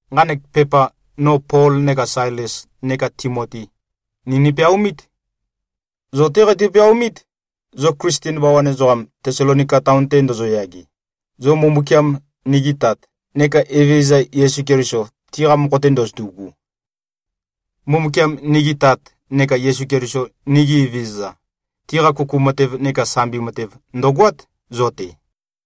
Nqanek pepa no Pol neka Sailes neka Timoti, ni nipeaomít. Zo-té qeitø-peaomít, zo Klisten bawan ezoqam, Tesalonika taon-te ndozoyage, zo Mbumbukiam, nigi Tat, neka Evezøza, Yesu Keliso, tiqa mokho-te ndozotu꞉gu. Mbumbukiam, nigi Tat, neka Yesu Keliso, nigi Evezøza, tiqa kuku matev neka sambi matev ndø̀goát, zo-te.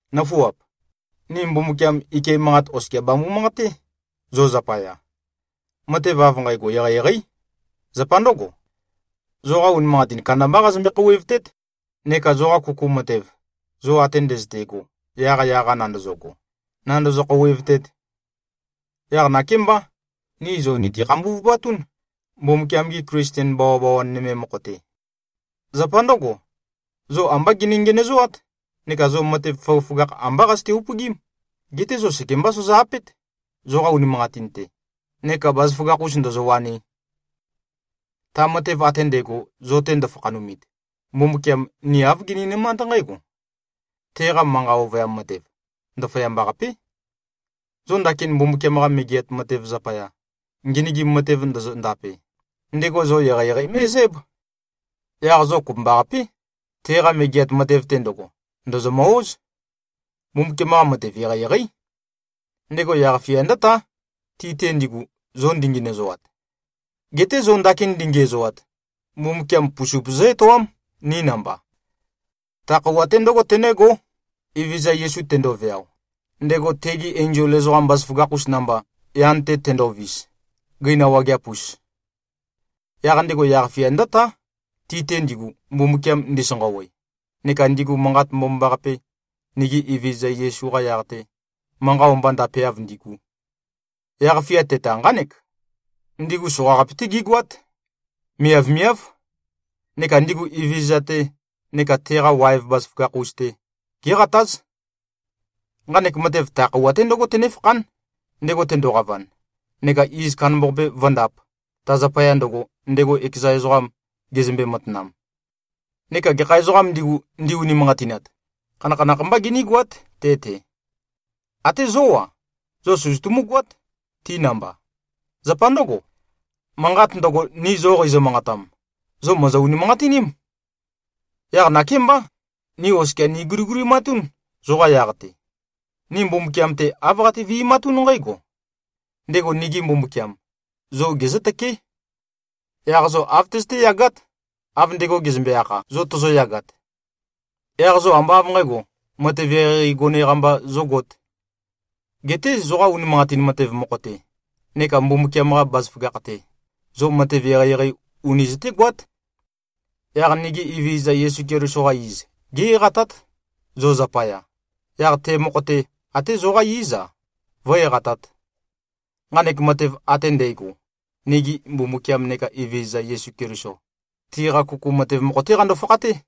Nǿfuap! Ni Mbumbukiam ike manqat oskia bambu-manqaté, zo zapaya. Matev av nqægo eqeieqeí. Zapa ndǿgo, zoqa unimanqatin kandambá qazømbe-khouwevtét, neka zoqa kuku matev, zo ate ndøzøte꞉go yaqyaq-a nandøzøgo, nāndø̄zø̄-khōūwēvtēt. Yaq nakémbá, ni zo nìti-khambuvupatún, Mbumbukiam-gi Klisten bawabawan nøme mokho-te. Zapa ndǿgo, zo ambá gini-ngenøzoát neka zo matev føgøføgakh ambá qazøte-upøgím, geté zo sekembá sozo-apét, zoqa unimanqatin-te neka bazaføgakh-us ndōzōwānī. Ta matev ate ndægo, zo-te ndøfakhanumit, Mbumbukiam, ni āv gininømánd nqǽgo: Teqa manqa ovøyam matev, ndaføyamba-qapé. Zo ndakin Mbumbukiam-qa Megeat Matev zapaya, ngenøgim matev ndozo-ndape, ndego zo eqeieqei mé꞉zǽb. Yaq zo kopømbaqapé, teqa Megeat Matev-te ndøgo, ndòzomø-óz. Mbumbukiam-qa matev eqeieqeí. Ndego yaq-fia ndǿtá, ti-te ndigu, zo ndingenøzoat. Geté zo ndakin ndingiæzoat, Mbumbukiam pusup zǿ-etoám, ni namba. Ta khøuwa-te ndǿgo tenǿgó, Evezøza Yesu tendoveao, ndego tegi enzol ezoqam bazaføgakh-us namba, yan-te tendovis, gøina wageap-us. Yaq ndego yaq-fia ndǿtá, ti-te ndigu, Mbumbukiam ndisanqawe neka ndigu Manqat Mbomambaqape, nigi Evezøza Yesu-qa yaq-te, manqa o-mba ndapeav ndigu. Yaq-fia teta, nqánek: Ndigu soqaqape-té gígoát. Miavmiáv. Neka ndigu Evezøza-te neka teqa waev bazaføgakh-us-te, géqatáz. Nqanek matev ta khøuwa-te ndǿgo tønéfakhán, ndego tendoqavan, neka iz kandambaqape vǿndāp, ta zapaya ndøgo, ndego ekeza ezoqam gezømbe-matanam. Neka gekha ezoqām ndigu, ndi-unimanqatinat, khanakhanakh mbá ginígoát te-te. Até zo-á, zo søzøtumú-goát, ti namba. Zapa ndǿgo, manqat ndøgo, ni zo qeizø-manqatam, zo mòzo-unimanqatiním. Yaq nakémbá, ni oskia niguligulimatún, zoqa yaq-te. Ni Mbumbukiam-te, āv qati-vi꞉matún nqǽgo: Ndego nigi Mbumbukiam, zo gezǿtøkeé. Yaq zo āv tøzøté-yagát, av ndego gezømbe-akha, zo tozoyagat. Yaq zo ambá av nqǣgo, matev eqeieqei gone-qa mba zógōt. Geté zoqa unimanqatin matev mokho-te neka Mbumbukiam-qa bazaføgakh-te, zo matev eqeieqei uni zøtégoát. Yaq nigi Evezøza Yesu Keliso-qa iz, gé-eqatát, zo zapaya, yaq te mokho-te, até zoqá íz-a, vǿ-eqatāt. Nqanek matev ate ndægo, nigi Mbumbukiam neka Evezøza Yesu Keliso, tiqa kuku matev mokho-té qando-fakhaté.